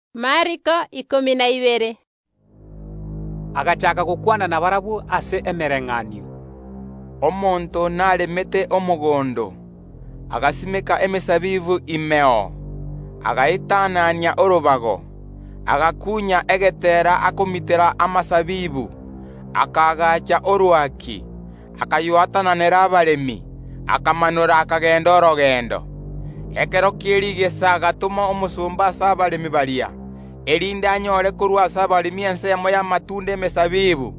Yeso agachaaka gokwana nabarabwo ase emebayeeno. “Omonto naremete omogondo, agasimeka emesabibu imeo, akayogitera orobago, agakunya egetera akomitera amasabibu, akaagacha orwaki, akaywatananera abaremi, akamanora akagenda orogendo. Ekero kie rigesa agatoma omosomba ase abaremi baria, erinde anyore korwa ase abaremi ensemo y’amatunda y’emesabibu.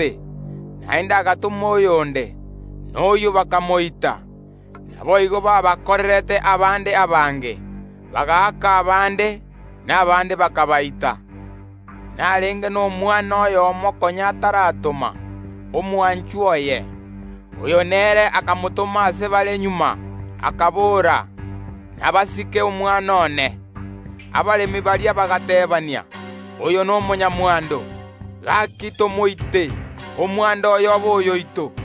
Omonto oria naende agatoma omosomba onde naende, na oyio bakamoita agakwa. Naboigo babakorerete abande abange; bagaaka abande, na abande bakabaita bagakwa. Narenge nomwana oyomo konya ataratoma, omwanchwa oye; oyo nere akamotoma ase bare magega, okobora: Inabasike omwana one. Abaremi baria bagateebania: Oyo nomonyamwando; inchwo tomoite, omwando oye obe oyoito.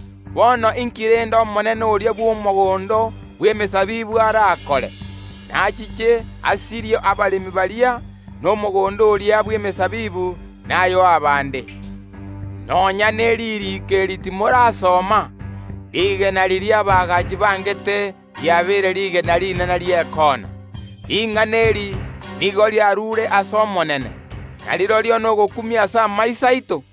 Bono inki rende omonene oria bw’omogondo bw’emesabibu arakore? Nachiche asirie abaremi baria, na omogondo oria bw’emesabibu nayoe abande. Nonya neririiko eri timorarisoma: “Rigena riria abaagachi bangete riabeire rigena rinene ri’ekoona. Ring’ana eri nigo riarure ase Omonene, na rirorio nogokumia ase amaiso aito?”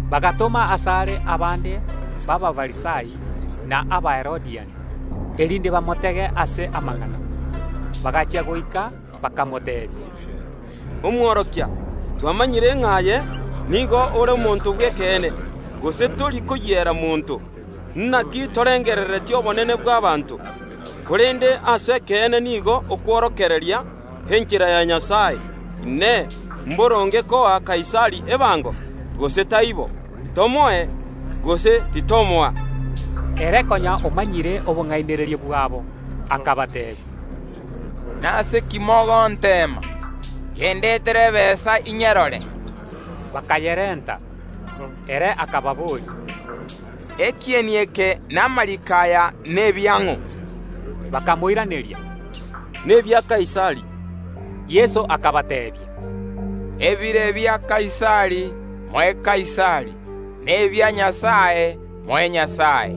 Bagatoma asare abande b’Abafarisai na Abaherodia, erinde bamotege ase amang’ana. Bagachia goika bakamoteebia, “Omworokia, twamanyire ng’a aye nigo ore omonto bw’ekeene, gose tori koyiera monto, naki torengerereti obonene bw’ abanto, korende ase ekeene nigo okworokereria enchera ya Nyasae. Inee! Mboronge koa Kaisari ebango, gose taibo? Tomoe, gose titomoa?” Korende Yeso ere konya omanyire obong’ainereria bwabo, akabateebia: Nase ki mogonteema? Yendetere ebesa inyerore! Bakayerenta. Ere akababoria, “Ekieni eke na amariiko aya nebiang’o?” Bakamoiraneria, “Nebia Kaisari.” Erio Yeso akabateebia, “Ebire bia Kaisari, moe Kaisari, na ebia Nyasae, moe Nyasae.”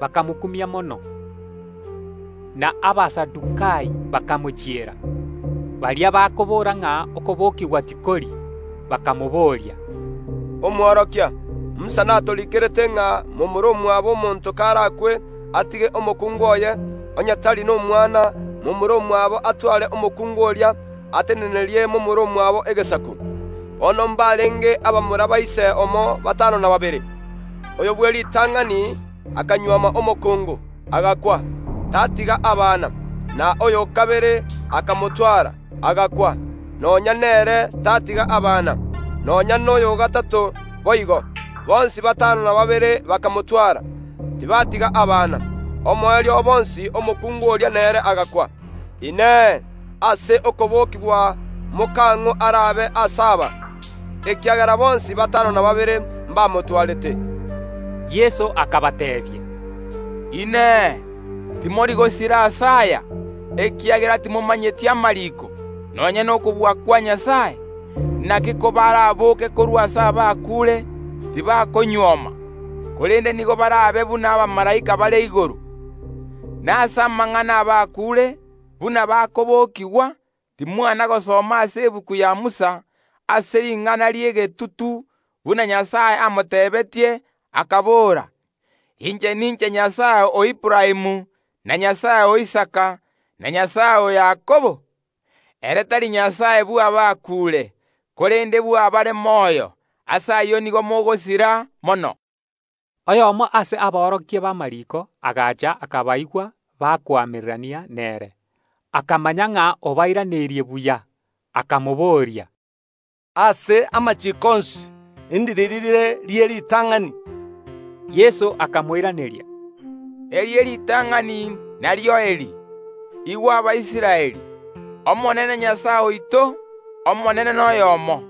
Bakamokumia mono. Na Abasadukai bagachiera Yeso, baria bakoboora ng’a okobokigwa tikori, bakamobooria, “Omworokia, Musa natoriikerete ng’a momura omwabo omonto karakwe atige omokungu oye; onye tari n’omwana, momura omwabo atware omokungu oria, atenenerie momura omwabo egesaku. Bono mbarenge abamura ba ise omo batano na babere. Oyo bw’eritang’ani akanyuoma omokungu, agakwa, tatiga abana. Na oyo o kabere akamotwara, agakwa; nonya nere tatiga abana; nonya noyo o gatato boigo. Bonsi batano na babere bakamotwara, tibatiga abana. Omoerio o bonsi omokungu oria nere agakwa. Inee! Ase okobokigwa ’mokang’o arabe ase aba? Ekiagera bonsi batano na babere mbamotwarete.” Yeso akabateebia, “Inee! Timori gosira ase aya, ekiagera timomanyeti amariiko, nonya nokobua kwa Nyasae? Inaki kobaraboke korwa ase abakuure, tibakonyuoma, korende nigo barabe buna abamalaika bare igoro. Nase amang’ana y’abakuure, buna bakobokigwa, timwana gosoma ase egetabu ya Musa, ase ring’ana ri’egetutu, buna Nyasae amotebetie, akabora: Inche ninche Nyasae bw’Aburaamu, na Nyasae o Isaka, na Nyasae o Yakobo? Ere tari Nyasae bw’abakuure, korende bw’abare moyo; ase ayio nigo mogosira mono.” Oyomo ase aborokia b’amariiko agacha akabaigwa bakoamererania nere, akamanya ng’a obairaneirie buya, akamobooria, “Ase amachiiko onsi ndiriri rire rie ritang’ani?” Yeso akamoiraneria, “Erie ritang’ani nario eri: Igwa, Abaisraeli, Omonene oito, Nyasae, Nere Omonene oyomo;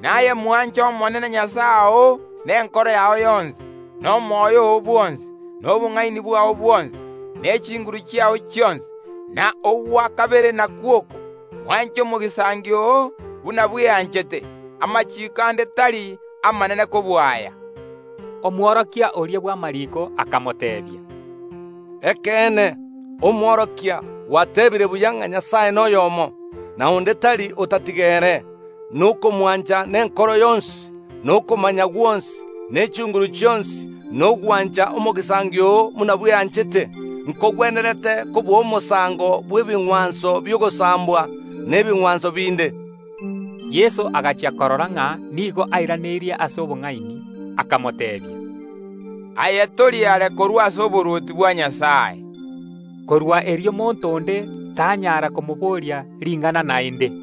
naye mwanche Omonene oo nenkoro yao yonsi, na omoyo oo bwonsi, na obong’aini bwao bwonsi, ne chinguru chiao chionsi. Na ogwa kabere nakwo oko: Mwanche omogisangio oo buna bweanchete. Amachiiko ande tari amanene kobua aya.” Omworokia oria bw’amariiko agateebia Yeso, “Ekeene, Omworokia, gwateebire buya ng’a Nyasae noyomo, na onde tari otatiga ere; na komwancha nenkoro yonsi, na okomanya gwonsi, ne chinguru chionsi, na gwancha omogisangio oo buna bweanchete, nkogwenerete kobua omosango bw’ebing’wanso bi’ogosambwa na ebing’wanso binde.” Yeso agachia korora ng’a nigo airaneria ase obong’aini, akamoteebia, “Aye tori are korwa ase oborwoti bwa Nyasae.” Korwa erio monto onde tanyara komoboria ring’ana naende.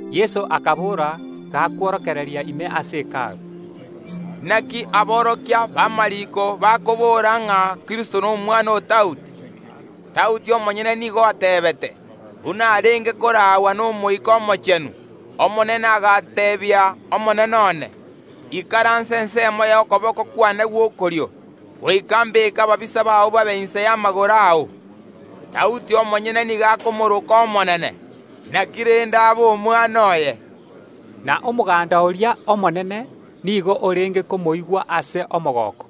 Yeso akabora gakworokereria ime ase Hekalu, “Inaki aborokia b’amariiko bakobora ng’a Kristo nomwana o Daudi? Daudi omonyene nigo ateebete, buna arenge koraagwa n’Omoika Omochenu: “Agateeba Omonene agakwana n’Omonene one Ikaransa ensemo y’okoboko kwane gw’okorio, goika mbeke ababisa bao babe inse y’amagoro ao”. Daudi omonyene nigo akomoroka Omonene; inaki rende Masihi aba omwana oye? Na omoganda oria omonene nigo orenge komoigwa ase omogooko.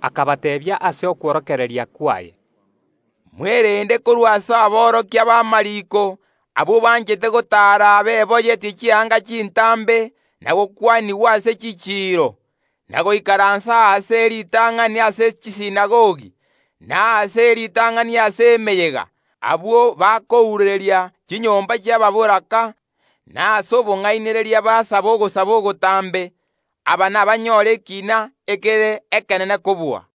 Akabateebia ase okworokereria kwaye, “Mwerende korwa ase aborokia b’amariiko, abwo banchete gotaara beboyetie chianga chintambe, na gokwanigwa ase chichiiro, na goikaransa aase e ritang’ani ase chisinagogi, na aase e ritang’ani ase emeyega. Abwo bakounereria chinyomba ch’ababoraka, na ase obong’ainereria basaba ogosaba ogotambe; aba nabanyore ekiina ekere ekenene kobua.”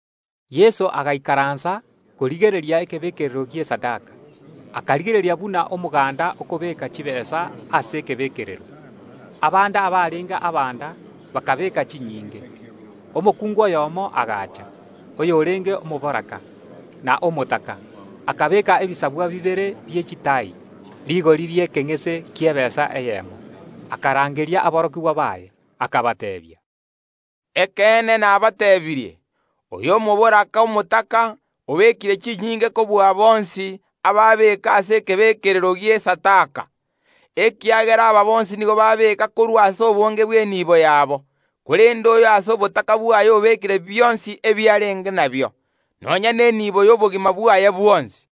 Yeso agaikaransa korigereria ekebekerero gi’esadaka, akarigereria buna omoganda okobeeka chitaabu ase ekebekerero. Abande abarenge abanda bakabeeka chinyinge. Omokungu oyomo agacha, oyorenge omoboraka na omotaka, akabeeka ebisabwa bibere bie chitaai, rigori ri’ekeng’ese ki’ebesa eyemo. Akarangeria aborokigwa baye, akabateebia, “Ekeene nabateebirie: Oyo omoboraka omotaka obekire chinyinge kobua bonsi ababeeka ase ekebeekerero gi’esadaka, ekiagera aba bonsi nigo babeeka korwa ase ogoiteka kw’obonda bwabo; korende oyo ase obotaka bwaye obekire bionsi ebiarenge nabio, nonya n’enibo y’obogima bwaye bwonsi.”